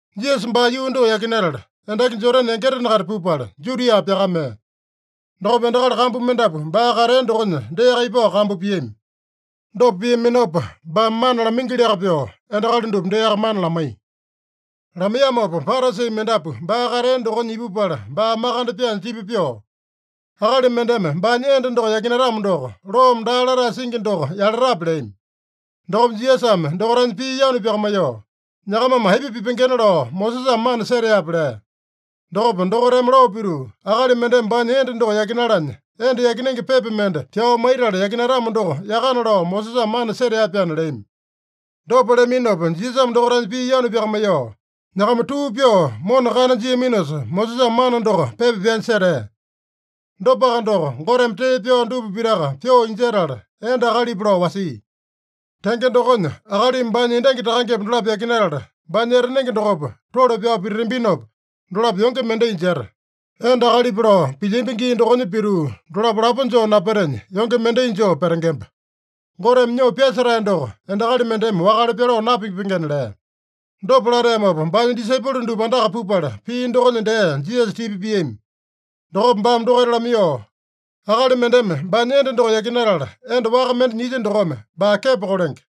Jisasa baa yuu doko yakinatala, endaki Jodane yangitena-kaita pupala, Judia pyakamea. Dokopa endakali kambu mendapu baa katea dokonya deaka ipao kambu piami. Dopa piaminopa, baame mana lamaingiliaka pyoo, endakali dupa deaka mana lamaiya. Lamaiyamopa Parasi mendapu baa katea dokonya ipupala baa makande pyaanya tipa pyoo, “Akali mendeme baanya enda doko yakinatamo doko, loome daa latae singi doko yalatape?” leami. Dokopa Jisasame dokaitanya pii yanu pyakamaiyoo, “Nyakamame aipa pipengena lao Mosesame mana seteape?” lea. Dokopa dokaitame lao pituu, “Akali mendeme baanya enda doko yakinalanya, enda yakinenge pepa mende pyao maitala yakinatamo doko yakana lao Mosesame mana setea-pyaana” leami. Dopa leaminopa Jisasame dokaitanya pii yanu pyakamaiyoo, “Nyakama tuu pyoo mona kana jiaminosa, Mosesame mana doko pepa pyanya setea. Dopaka doko, Goteme tee pyao dupa pitaka pyoo injetala, enda akalipa lao wasia. Tenge dokonya, akalimi baanya endangi takangepa dolapo yakinatala, baanya etanenge dokopa tole pyao pititambinopa, dolapo yonge mendai jeta. Enda akalipa lao pilyambi gii dokonya pituu dolapo lapo joo napetenya, yonge mendai joo petengemba. Goteme nyoo pyasetae doko endakali mendeme wakale pyaloo napipengena” lea. Dopa lateamopa, baanya disaipolo dupa andaka pupala, pii dokonya dee Jisasa tipa piami. Dokopa baame dokaita lamaiyoo, “Akali mendeme baanya enda doko yakinatala, enda waka mende nyilya dokome, baa kepo kolenge.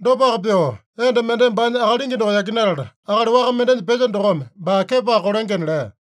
Dopaka pyoo, enda mendeme baanya akalingi doko yakinatala, akali waka mendenya pelya dokome, baa kepoaka kolengena” lea.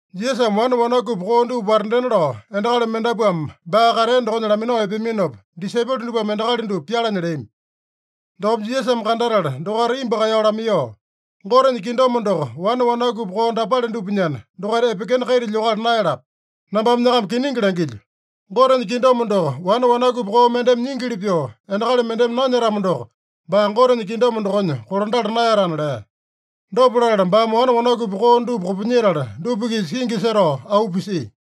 Jisasame wane wanakupi koo dupa watandena lao, endakali mendapuame baa katea dokonya laminao epeaminopa, disaipolo dupame endakali dupa pyalanya leami. Dokopa Jisasame kandatala dokaita imbu kaeyao lamaiyoo, “Gotenya kingdom doko wane wanakupi koo dapale dupanyana, dokaita epekena kaita lyokala naeyalapa. Nambame nyakama kiningi langilyo: Gotenya kingdom doko wane wanakupi koo mendeme nyingili pyoo, endakali mendeme nanyetamo doko, baa Gotenya kingdom dokonya kolandala naeyatana” lea. Dopa latala baame wane wanakupi koo dupa kopinyetala, dupa-kisa kingi setao auu pisia.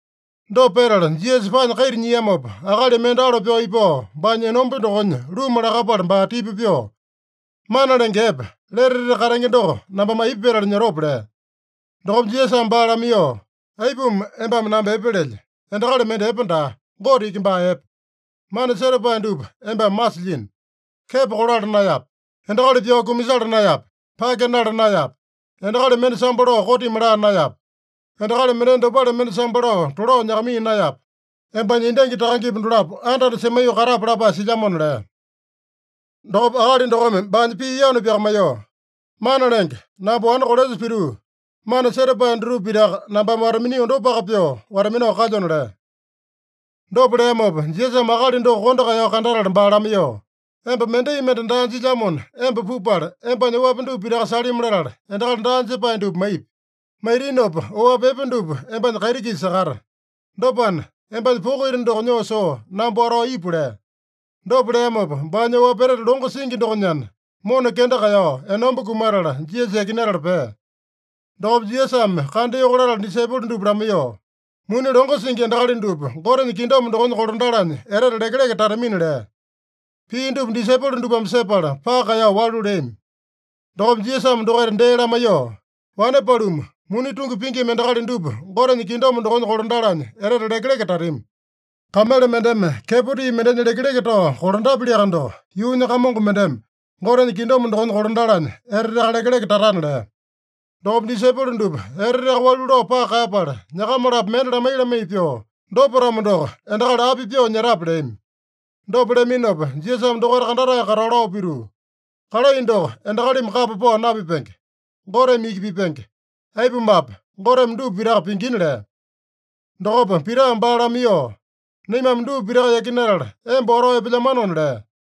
Dopa petala Jisasa paanya kaita nyiamopa, akali mende alo pyao ipao, baanya enomba dokonya luma lakapala baa tipa pyoo, “Mana Lenge Epe, lete etete katenge doko nambame aipa petala nyotope?” lea. Dokopa Jisasame baa lamaiyoo, “Aipuma embame namba epe lelye? Endakali mende epe daa. Gote iki baa epe. Mana setapae dupa embame masilyino: Kepo kolala naeyape. Endakali pyao kumasala naeyape. Pake nala naeyape. Endakali mende sambo lao kotimi laa naeyape. Endakali mendenya dopale mende sambo lao tolao nyakamaiya naeyape. Embanya endangi takangepa dolapo anda-anda semaiyoo katape lapae silyamona” lea. Dokopa akali dokome baanya pii yanu pyakamaiyoo, “Mana Lenge, namba wane kolesa pituu, mana setapae dutupa pitaka nambame wata-minio dopaka pyoo wata-minao kalyona” lea. Dopa leamopa, Jisasame akali doko kondo kaeyao kandatala baa lamaiyoo, “Emba mendai mende daa jilyamona, emba pupala, embanya oapi dupa pitaka salimi latala, endakali daa jepae dupa maipi. Maitinopa oapi epe dupa embanya kaiti-kisa sakata. Dopana, embanya poko ita doko nyoo soo namba watao ipu” lea. Dopa leamopa, baanya oapi etete longo singi dokonyana, mona kenda kaeyao enomba kumatala, Jisasa yakinatala pea. Dokopa Jisasame kandayoko latala disaipolo dupa lamaiyoo, “Muni longo singi endakali dupa Gotenya kingdom dokonya kolandalanya etete lekeleke tatamina” lea. Pii dupa disaipolo dupame sepala, paka kaeyao walu leami. Dokopa Jisasame dokaita dee lamaiyoo, “Wane paluma, muni tungi pingima endakali dupa Gotenya kingdom dokonya kolandalanya etete lekeleke tatami. Kamele mendeme kepo tii mendenya lekeleke tao kolandapyaliaka doko, yuunya kamongo mendeme Gotenya kingdom dokonya kolandalanya eteteaka lekeleke tatana” lea. Dokopa disaipolo dupa eteteaka walu lao paka kaeyapala, nyakama-lapo mende lamai-lamai pyoo, “Dopa-tamo doko, endakali api pyoo nyetape?” leami. Dopa leaminopa Jisasame dokaita kandatae katao lao pituu, “Kalai doko endakalimi kapa pao napipenge. Goteme iki pipenge. Aipumape, Goteme dupa pitaka pingina” lea. Dokopa Pitame baa lamaiyoo, “Naimame dupa pitaka yakinatala emba watao epelyamanona” lea.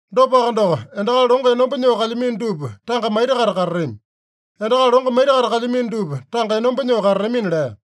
Dopaka doko, endakali longo enomba nyoo kalyamino dupa tanga maita-kaita katatami. Endakali longo maita-kaita kalyamino dupa tanga enomba nyoo katatamina” lea.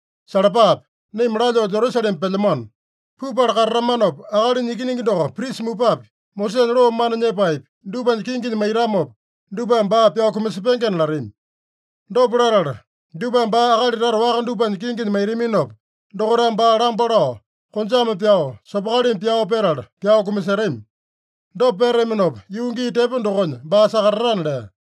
“Salapape! Naima lalyoo Jerusalema pelyamano. Pupala katatamanopa, Akalinya Ikiningi doko prisa mupapi, Mosesanya loo mana nyepaepi, dupanya kinginya maitamopa, dupame baa pyao kumasepengena latami. Dopa latala dupame baa akali tata waka dupanya kinginya maitaminopa, dokaitame baa lamba lao, konjame pyao, sopokalimi pyao petala, pyao kumasetami. Dopa petataminopa, yuu gii tepo dokonya baa sakatatana” lea.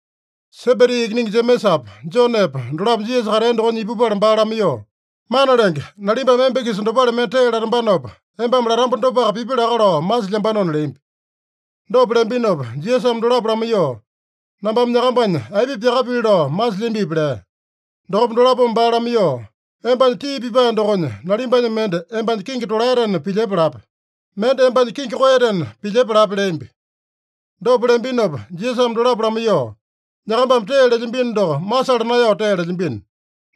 Sebedi ikiningi Jemesapa, Jonepa dolapo Jisasa katea dokonya ipupala baa lamaiyoo, “Mana Lenge, nalimbame emba-kisa dopale mende tee latambanopa, embame latamba dopaka pipi laka lao masilyambanona” leambi. Dopa leambinopa Jisasame dolapo lamaiyoo, “Nambame nyakambanya aipa pyakapili lao masilyambipi?” lea. Dokopa dolapome baa lamaiyoo, “Embanya tii pipae dokonya, nalimbanya mende embanya kingi tolaetena pilyepa lape. Mende embanya kingi koeyatena pilyepa lape” leambi. Dopa leambinopa Jisasame dolapo lamaiyoo, “Nyakambame tee lelyambino doko masala naeyao tee lelyambino.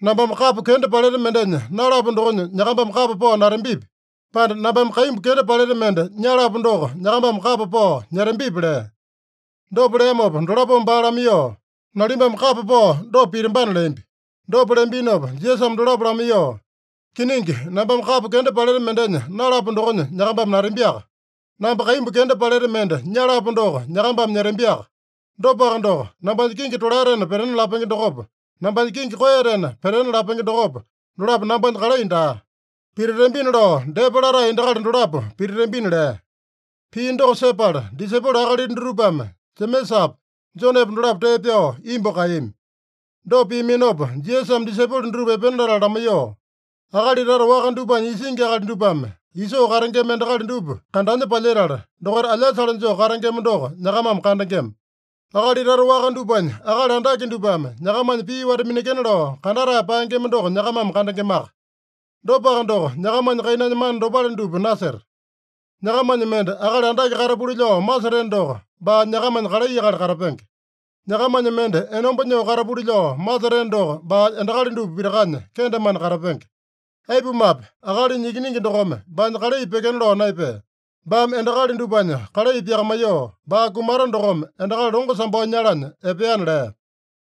Nambame kapo kenda paleta mendenya nalapo dokonya nyakambame kapa pao natambipi, pande nambame kaimbu kenda paleta mende nyalapo doko nyakambame kapa pao nyetambipi?” lea. Dopa leamopa dolapome baa lamaiyoo, “Nalimbame kapa pao dopa pitambana” leambi. Dopa leambinopa Jisasame dolapo lamaiyoo, “Kiningi, nambame kapo kenda paleta mendenya nalapo dokonya nyakambame natambiaka. Namba kaimbu kenda paleta mende nyalapo doko nyakambame nyetambiaka. Dopaka doko, nambanya kingi tolaetena petena lapenge dokopa, nambanya kingi koeyatena petena lapenge dokopa, dolapo nambanya kalai daa. Pititambina lao depa latae endakali dolapo pititambina” lea. Pii doko sepala, disaipolo akalita dutupame Jemesapa, Jonepa dolapo tee pyao imbu kaeyami. Dopa piaminopa, Jisasame disaipolo dutupa epena latala lamaiyoo, “Akali tata waka dupanya isingi akali dupame isoo katengema endakali dupa kandanya palyetala, dokaita alyasale joo katengema doko nyakamame kandengema. Akali tata waka dupanya akali andake dupame nyakamanya pii wata-minekena lao kandatae paengema doko nyakamame kandengemaka. Dopaka doko, nyakamanya kainanya mana dopale dupa naseta. Nyakamanya mende akali andake katapuli lao maseteno doko, baa nyakamanya kalai akali katapenge. Nyakamanya mende enomba nyoo katapuli lao maseteno doko, baa endakali dupa pitakanya kendemane katapenge. Aipumape, Akalinya Ikiningi dokome baanya kalai pyekena lao naepea. Baame endakali dupanya kalai pyakamaiyoo, baa kumata dokome endakali longo sambao nyalanya epeana” lea.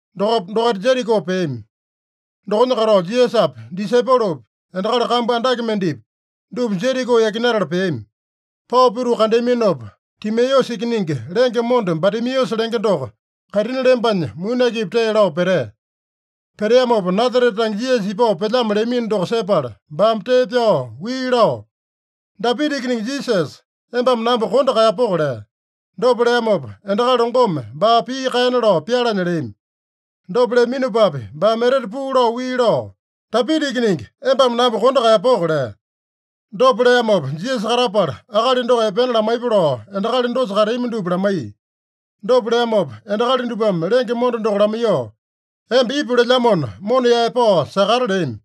Dokopa dokaita Jeriko peami. Dokonya katao, Jisasapi, disaipolopi, endakali kambu andake mendepi, dupa Jeriko yakinatala peami. Pao pituu kandeaminopa, Timeusa ikiningi, lenge monda Batimeusa lenge doko kaitini lembanya muni akipi tee lao petea. Peteamopa Nasarete tange Jisasa ipao pelyamo leamino doko sepala, baame tee pyao wii lao, “Dapita Ikiningi Jisasa, embame namba kondo kaeyapoko!” lea. Dopa leamopa, endakali longome baa pii kaena lao pyalanya leami. Dopa leaminopapi, baame etete puu lao wii lao, “Dapita Ikiningi, embame namba kondo kaeyapoko!” lea. Dopa leamopa Jisasa katapala, akali doko epena lamaiyepa lao endakali dosa kateami dupa lamaiya. Dopa leamopa, endakali dupame lenge monda doko lamaiyoo, “Emba ipu lelyamona, mona yaepao sakata” leami.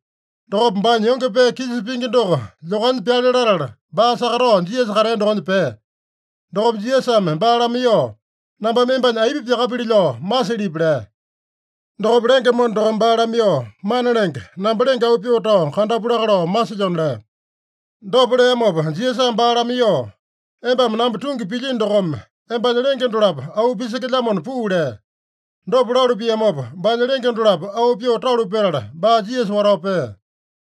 Dokopa baanya yonge pee kisa pingi doko lyokanya pyale latala, baa sakatao Jisasa katea dokonya pea. Dokopa Jisasame baa lamaiyoo, “Nambame embanya aipa pyakapili lao masilyipi?” lea. Dokopa lenge monda dokome baa lamaiyoo, “Mana Lenge, namba lenge auu pyoo tao kandapu laka lao masilyona” lea. Dopa leamopa Jisasame baa lamaiyoo, “Embame namba tungi pilyino dokome, embanya lenge dolapo auu pisekelyamona puu” lea. Dopa lalu piamopa, baanya lenge dolapo auu pyoo talu petala, baa Jisasa watao pea.